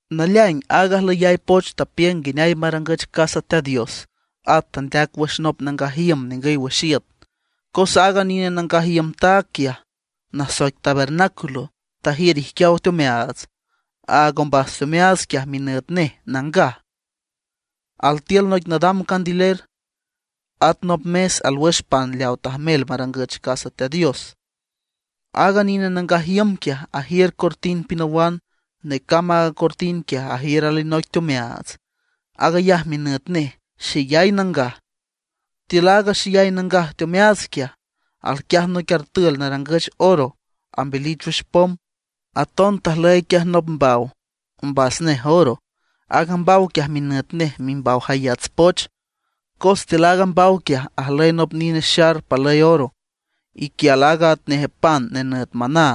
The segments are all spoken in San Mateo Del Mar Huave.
Naleaing aaga ajlüyay poch tapiüng nguineay marangüch casa Teat Dios, at tandeac wüx nop nangaj iüm ningüy wüx iüt. Cos aaga nine nangaj iüm taag quiaj, nasoic tabernáculo, tajiür ijquiaw teomeaats. Aaga ombas teomeaats quiaj minüt nej Nangaj. Altiül noic nadam candiler, at nop mes alwüx pan leawa tajmel marangüch casa Teat Dios. Aaga nine nangaj iüm quiaj ajiür cortin pinawan; necamb aaga cortin quiaj ajiür alinoic teomeaats; aag ayaj minüt nej Xeyay Nangaj. Tiül aaga Xeyay Nangaj teomeaats quiaj, alquiaj noic artül narangüch oro ambeliw wüx pom. Aton tajlüy quiaj nop mbaw, ombas nej oro. Aaga mbaw quiaj minüt nej Mimbaw Jayats Poch, cos tiül aaga mbaw quiaj ajlüy nop nine xar palüy oro, iquial aaga atnej pan nenüt maná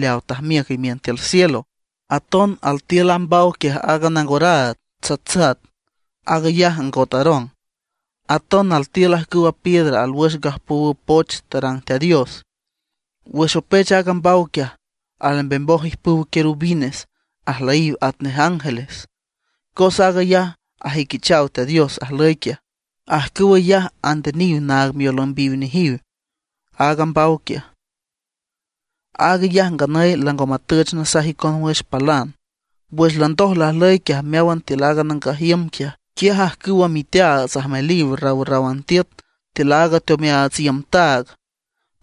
leaw tajmiüc imiün tiül cielo. Aton altiül a mbaw quiaj aaga nangoraad tsatsat, aag ayaj angot Aarón. Átan altiül ajcüwa piedra alwüx gajpowüw poch tarang Teat Dios. Wüx opech aaga mbaw quiaj alembemoj ijpüw querubines, ajlüyiw atnej ángeles, cos aag ayaj ajüiquichaw Teat Dios ajlüy quiaj. Ajcüw ayaj andeniw naag miolümbiw nejiw aaga mbaw quiaj. Aag ayaj nganüy lango matüch nasaj icon wüx palan. Wüx landoj lajlüy quiaj meáwan tiül aaga nangaj iüm quiaj, quiaj ajcüwa miteaats ajmeliw rawrráwan tiüt tiül aaga mbas teomeaats iüm taag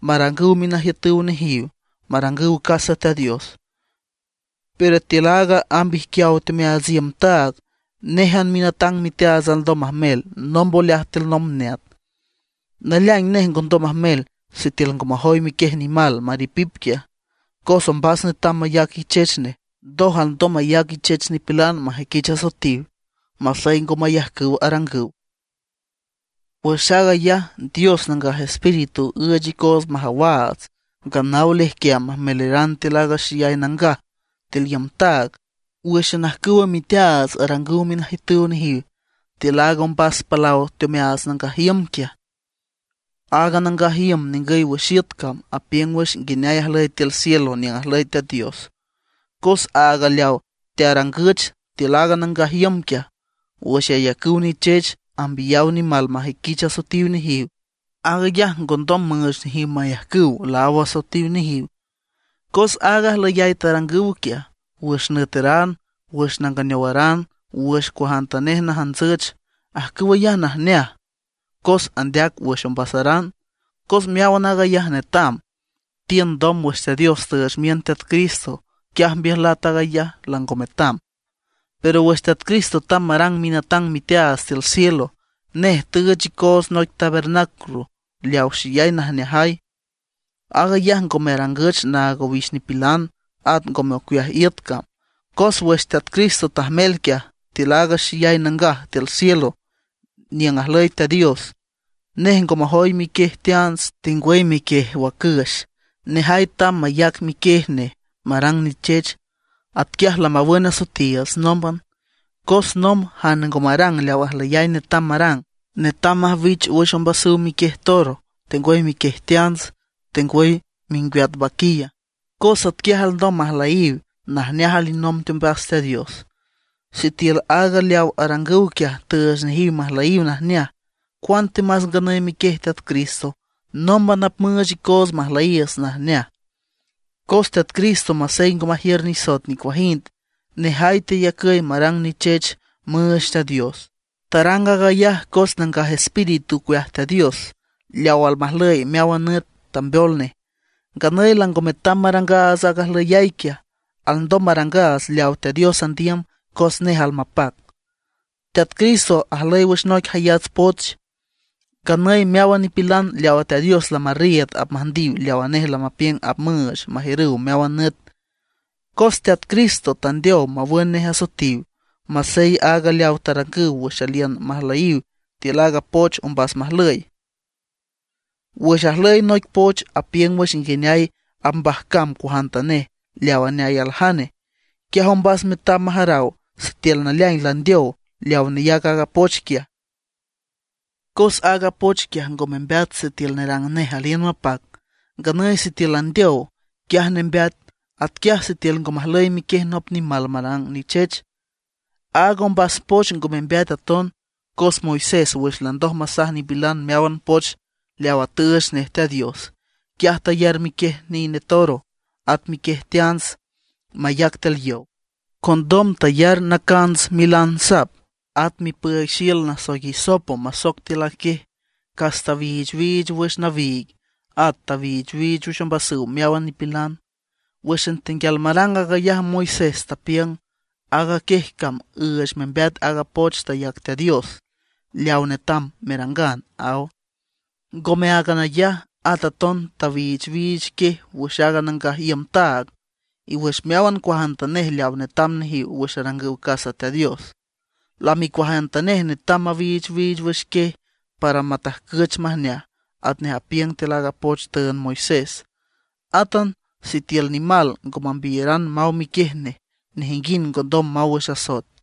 marangüw minajiütüw nejiw marangüw casa Teat Dios. Pero tiül aaga amb ijquiaw teomeaats iüm taag, néjan minatang miteaats alndom majmel nomb oleaj tiül nomb neat. Naleaing nej ngondom majmel sitiül ngo majoy miquiej nimal maripip quiaj, cos ombas netam mayac ichech nej, ndoj alndom mayac ichech nipilan majüiquich asoetiw masey ngo mayajcüw arangüw. Wüx aag ayaj Dios Nangaj Espíritu üüch icoots majawaats nganaw lejquiam majmeleran tiül aaga Xeyay Nangaj tiül iüm taag, wǘxan ajcüw miteaats arangüw minajiütüw nejiw tiül aaga ombas palaw teomeaats nangaj iüm quiaj. Aaga nangaj iüm ningüy wüx iüt cam apiüng wüx nguineay ajlüy tiül cielo niüng ajlüy Teat Dios. Cos aaga leaw tearangüch tiül aaga nangaj iüm quiaj, wüx ayacüw nichech, ambiyaw nimal majüiquich asoetiw nejiw, aag ayaj ngondom müüch nejiw mayajcüw laáw asoetiw nejiw. Cos aaga ajlüyay tarangüw quiaj wüx nüeteran, wüx nanganeowaran, wüx cuajantanej najantsüch; ajcüw ayaj najneaj, ocueaj ombasaran. Cos meáwan aag ayaj tetam, tiün ndom wüx Teat Dios tüüch miün Teat Cristo, quiaj mbiüjlat aag ayaj, lango metam. Pero wüx Teat Cristo tamb marang minatang miteaats tiül cielo, nej tüüch icoots noic tabernáculo leaw xeyay najneajay. Aag ayaj ngome arangüch naag owix nipilan, at ngome ocueaj iüt cam. Cos wüx Teat Cristo tajmel quiaj tiül aaga Xeyay Nangaj tiül cielo niüng ajlüy Teat Dios, nej ngo majoy miquiej teants, tengwüy miquiej wacüx; nejay tamb mayac miquiej nej marang nichech. Atquiaj lamawün asoetiiüts nómban. Cos nomb jane ngo marang leaw ajlüyay netam marang, netam majwich wüx ombasüw miquiej toro, tengwüy miquiej teants, tengwüy mingweat vaquilla; cos atquiaj alndom majlüyiw najneaj alinomb teombas Teat Dios. Sitiül aaga leaw arangüw quiaj tüüch nejiw majlüyiw najneaj, ¡cuantemas nganüy miquiej Teat Cristo nómban apmüüch icoots majlüyiiüts najneaj! Cos Teat Cristo masey ngo majiür nisoet nicuajind, nejay teyacüy marang nichech müüch Teat Dios. Tarang aag ayaj cos Nangaj Espíritu ocueaj Teat Dios leaw almajlüy meáwan nüt tambeol nej. Nganüy lango metam marangaats aaga ajlüyay quiaj; alndom marangaats leaw Teat Dios andiüm cos nej almapac. Teat Cristo ajlüy wüx noic jayats poch. Nganüy meáwan nipilan leawa Teat Dios lamarriiüd apmüjndiw leawa nej lamapiüng apmüüch majiürüw meáwan nüt. Cos Teat Cristo tandeow mawün nej asoetiw, masey áag leawa tarangüw wüx aliün majlüyiw tiül aaga poch ombas majlüy. Wüx ajlüy noic poch apiüng wüx nguineay apmbajcam cuajantanej leaw aneay aljane, quiaj ombas netam majaraw sitiül naleaing landeow leaw neyac aaga poch quiaj, Cos aaga poch quiaj ngo membeat sitiül nerang nej aliün mapac; nganüy sitiül landeow, quiaj nembeat. Atquiaj sitiül ngo majlüy miquiej nop nimal marang nichech, aaga ombas poch ngo membeat aton. Cos Moisés wüx landoj masaj nipilan meáwan poch leawa tüüch nej Teat Dios, quiaj tayar miquiej nine toro, at miquiej teants, mayac tiül yow; condom tayar nacants milan sap, at mipüüig xiül nasoic hisopo masoc tiül a quiej, cas tawiichwiich wüx nawiig; at tawiichwiich wüx ombasüw meáwan nipilan. Wǘxan tenguial marang aag ayaj Moisés tapiüng: “Aaga quiej cam üüch membeat aaga poch tayac Teat Dios, leaw netam merangan”, aw. Ngome áagan ayaj, at aton tawiichwiich quiej wüx aaga nangaj iüm taag, y wüx meáwan cuajantanej leawa netam nejiw wüx arangüw casa Teat Dios. Lami cuajantanej netam mawiichwiich wüx quiej para matajcüch majneaj atnej apiüng tiül aaga poch tüünd Moisés. Átan sitiül nimal ngo mambiyaran maw miquiej nej, nejinguind ngondom maw wüx asoet.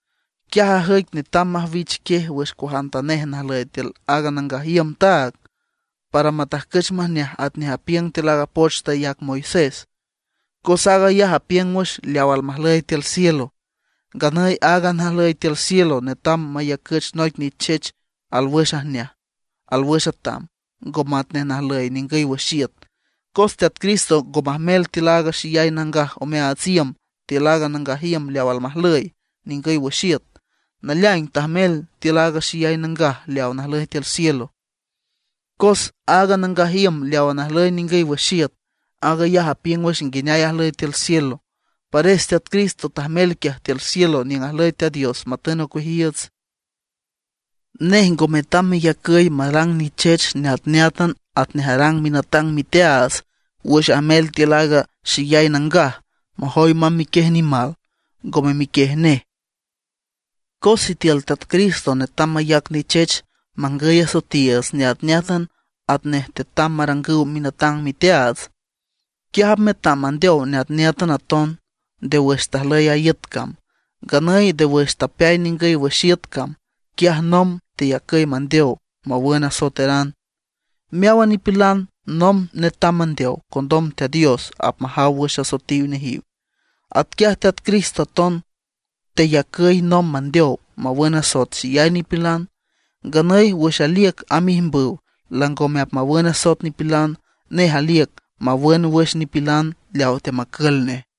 Quiaj ajüic netam majwich quiej wüx cuajantanej najlüy tiül aaga nangaj iüm taag, para matajcüch majneaj atnej apiüng tiül aaga poch tayac Moisés; cos aag ayaj apiüng wüx leaw almajlüy tiül cielo. Nganüy aaga najlüy tiül cielo netam mayacüch noic nichech alwüx ajneaj, alwüx atam, ngome atnej najlüy ningüy wüx iüt. Cos Teat Cristo ngo majmel tiül aaga Xeyay Nangaj omeaats iüm tiül nangaj iüm leaw almajlüy ningüy wüx iüt; naleaing, tajmel tiül aaga Xeyay Nangaj leawa najlüy tiül cielo. Cos aaga nangaj iüm leawa najlüy ningüy wüx iüt, aag ayaj apiüng wüx nguineay ajlüy tiül cielo. Pares Teat Cristo tajmel quiaj tiül cielo niüng ajlüy Teat Dios matün ocueajiiüts. Nej ngo metam meyacüy marang nichech neatneátan atnej arang minatang miteaats wüx ajmel tiül aaga Xeyay Nangaj majoy mamb miquiej nimal, ngome miquiej nej. Cos sitiül Teat Cristo netam mayac nichech mangüy asoetiiüts neatneátan atnej tetam marangüw minatang miteaats, quiaj apmetam mandeow neatneátan aton, nde wüx tajlüy aaga iüt cam. Nganüy nde wüx tapeay ningüy wüx iüt cam, quiaj nomb teyacüy mandeow mawün asoeteran. Meáwan nipilan nomb netam mandeow, condom Teat Dios apmajaw wüx asoetiw nejiw. Atquiaj Teat Cristo aton teyacüy nomb mandeow mawün asoet xeyay nipilan. Nganüy wüx aliüc amb ijmbüw langome apmawün asoet nipilan; nej aliüc mawün wüx nipilan leaw teamacül nej.